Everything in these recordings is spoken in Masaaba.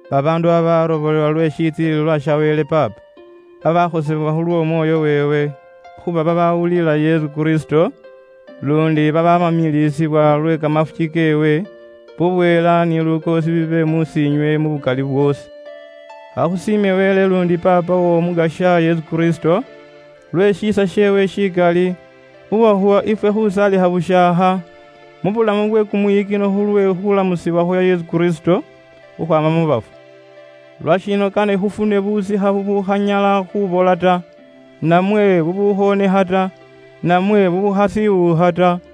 Babaandu babarobolewa lwe shitsilililwa sha Wele Paapa, bawaanibwayo buraawa lw'Omwoyo weewe, khuuba babawulila Yesu Kristo, luundi babamiliisibwa lwe kamafuki keewe. Bubweela ni lukoosi bibe mus'iinywe mu bukali bwoosi. Khakhusiime Wele luundi Paapa w'Omukasya Yesu Kristo, lwe shiisa sheewe shikali, uwakhuwa ife khusaalikha bushaakha mu bulamu bwe kumwiyikino khulwe khulamusibwa khwa Yesu Kristo khukhwaama mu bafu. Lwashino, kane ifwe khufune busikha bubukhanyala khuubola, namwe bwonekha, namwe bwabakho lisaanda ta.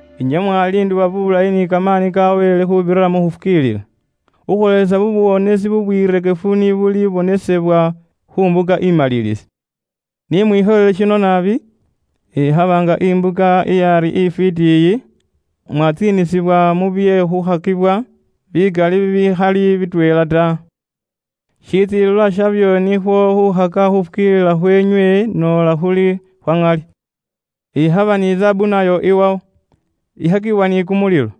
Inywe mwaliindibwa bulayi ni kamaani ka Wele khuubirira mu khufukiilila, khukhwoolesa buwonesi bubwirekefu ni bulibonesebwa khu mbuka imalilisi. Ni mwikhoyele shino naabi, ikhaba nga imbuka iyaari ifwiiti iyi, mwatsiinisibwa mu bye khukhakibwa bikali bibikhali bitweela ta. Shitsiilililwa shabyo nikhwo khuukhaka khuufukiilila khweenywe noola khuli khwa ŋali. Ikhaba ni zaabu nayo iwawo, ikhakibwa ni kumulilo,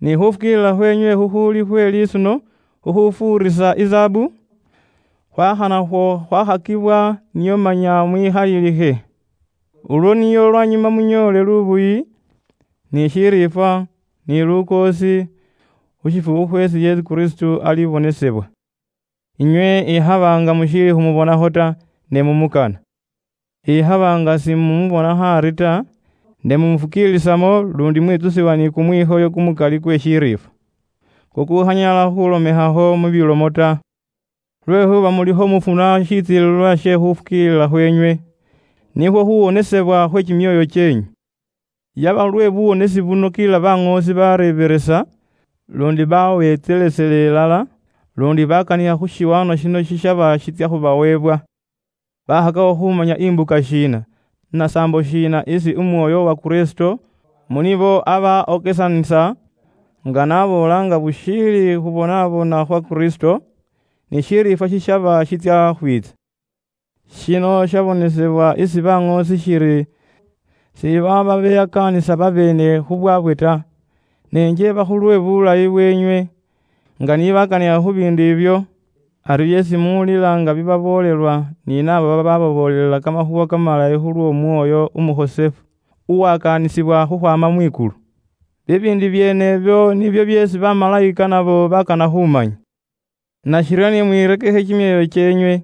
ni khufukiilila khweenywe khukhuuli khwe lisuno khukhufuurisa izaabu, khwakha nakhwo khwakhakibwa, nio manya mwikhalilikhe. Ulwo nio lwanyuma munyoole lubuyi, ni shiriifwa ni lukoosi khu shifukhu khweesi Yesu Kristo alibonesebwa. Inywe ikhaba nga mushiili khumubonakho ta, mumukana. Ikhaba nga simumubonakho ari ta, ne mumufukiilisamo luundi mwitsusibwa ni kumwikhoyo kumukali kwe shiriifwa kukukhanyala khulomewakho mu bilomo ta. Lwekhuuba mulikho mufuna shitsilililwa she khuufukiilila khweenywe, nikhwo khuuwonesebwa khwe kimyoyo kyeenywe. Yaba khulwe buwonesi buno kila baŋoosi baareebelesa, luundi baawentselesela ilala, luundi bakanikha khu shiwaanwa shino shishaba shitsya khubaweebwa. Bakhakakho khumanya imbuka shiina, na saambo shiina isi Umwoyo wa Kristo mu nibo aba okesanisa, nga niye n'aboola nga bushiili khu bye khubonabona khwa Kristo, ni shiriifwa shishaba shitsya khwiitsa. Shino shabonesebwa isi baŋoosi shiri sibaaba beyakaanisa babeene khu bwaabwe ta, nenjeeba khulwe bulayi bweenywe, nga ni bakanikha khu biindu ibyo ari byeesi muwulila nga bibaboolelwa ni naabo babaababoolela Kamakhuuwa Kamalayi khulw'Omwoyo Umukhosefu uwakaanisibwa khukhwaama Mwikulu. Bibiindu byeenebyo nibyo byeesi bamalayika nabo bakana khuumanya. Nashiryo ni mwirekekhe kimyoyo kyeenywe,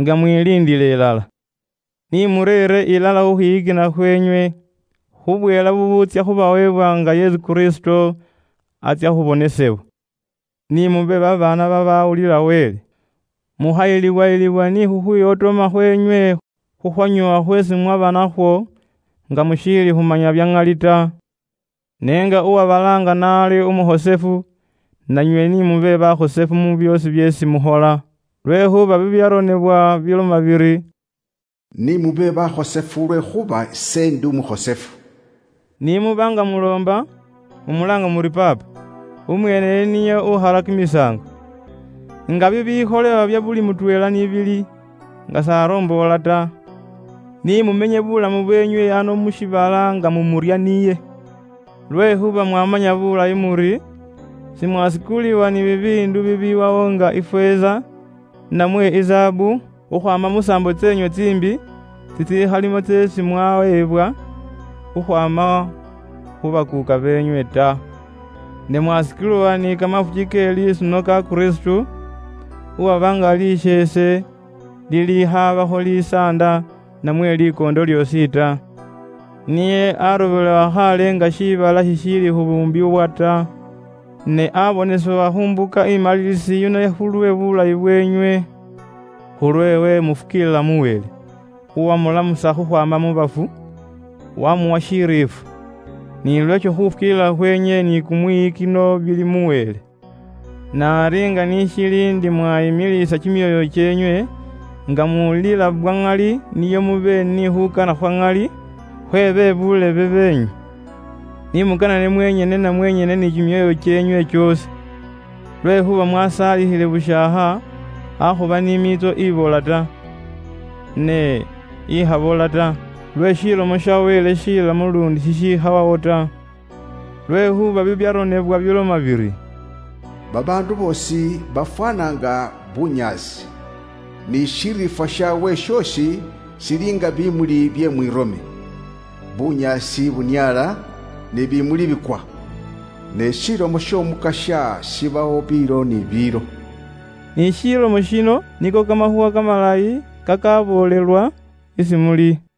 nga mwiliindila ilala. Ni mureere ilala khukhwiyikina khweenywe khu bweela bubuutsya khubaweebwa nga Yesu Kristo atsya khubonesebwa. Ni mube babaana babawulila Wele, mukhayilibwayilibwa ni khukhwiwotooma khweenywe khukhwanyoowa khweesi mwaba nakhwo nga mushiili khumanya bya ŋali ta. Ne nga uwabalaanga n'ali umukhosefu, nanywe ni mube bakhosefu mu byoosi byeesi mukhola. Lwekhuuba bibyaronebwa biloma biri, “Ni mube bakhosefu lwekhuuba ise ndi umukhosefu.” Ni muba nga muloomba, mumulaanga muri Paapa, umweeneyo niye ukhala kimisaango, nga bibikholewa bya buli mutweela ni bili, nga s'aromboora ta. Ni mumenye buulamu bweenywe ano mu shiibala nga mumurya niye. Lwekhuuba mwamanya bulayi muri, simwasikuliwa ni bibiindu bibiwawo nga ifeeza, namwe izaabu, khukhwaama musaambo tseenywe tsiimbi tsitsikhalimo tseesi mwaweebwa khukhwaama khu bakuuka beenywe ta. Ne mwasikuliwa ni kamafuki ke lisuno ka Kristo, uwaba nga khasheese khakhakhaabakho lisaanda namwe likoondo lyoosi ta. Niye arobolewa khaale nga shiibala shishiili khubuumbibwa ta, ne abonesebwa khu mbuka imalilisi yino khulwe bulayi bweenywe. Khulweewe mufukiilila mu Wele, uwamulamusa mu bafu, wamuwa shiriifwa. Ni lweesho khufukiilila khweenywe ni kumwiyikino bili mu Wele. Ne ari nga ni shili ndi inywe mwayipyeluusa kimyoyo kyeenywe nga muwulila bwa ŋali nio mube ni khuukana khwa ŋali khwe be buulebe beenywe. Ni mukanane mwenyene na mwenyene ni kimyoyo kyeenywe kyoosi. Lwekhuuba mwasaalikhile bushaakha, akhuba ni miitso ibola ta, ne ikhabola ta, lwe Lomo ya Wele inamu luundi ikhawawo ta. Lwekhuuba bibyaronebwa biloma biri; “Babaandu boosi bafwaana nga bunyaasi, ni shiriifwa shaabwe shoosi shili nga biimuli bye mwirome, bunyaasi buniaala, ni bimuli bikwa. Ne Ilomo y'Omukasya ibawo biilo ni biilo.” Ni ilomo yino niko kamakhuuwa kamalayi kakaaboolelwa isi muli.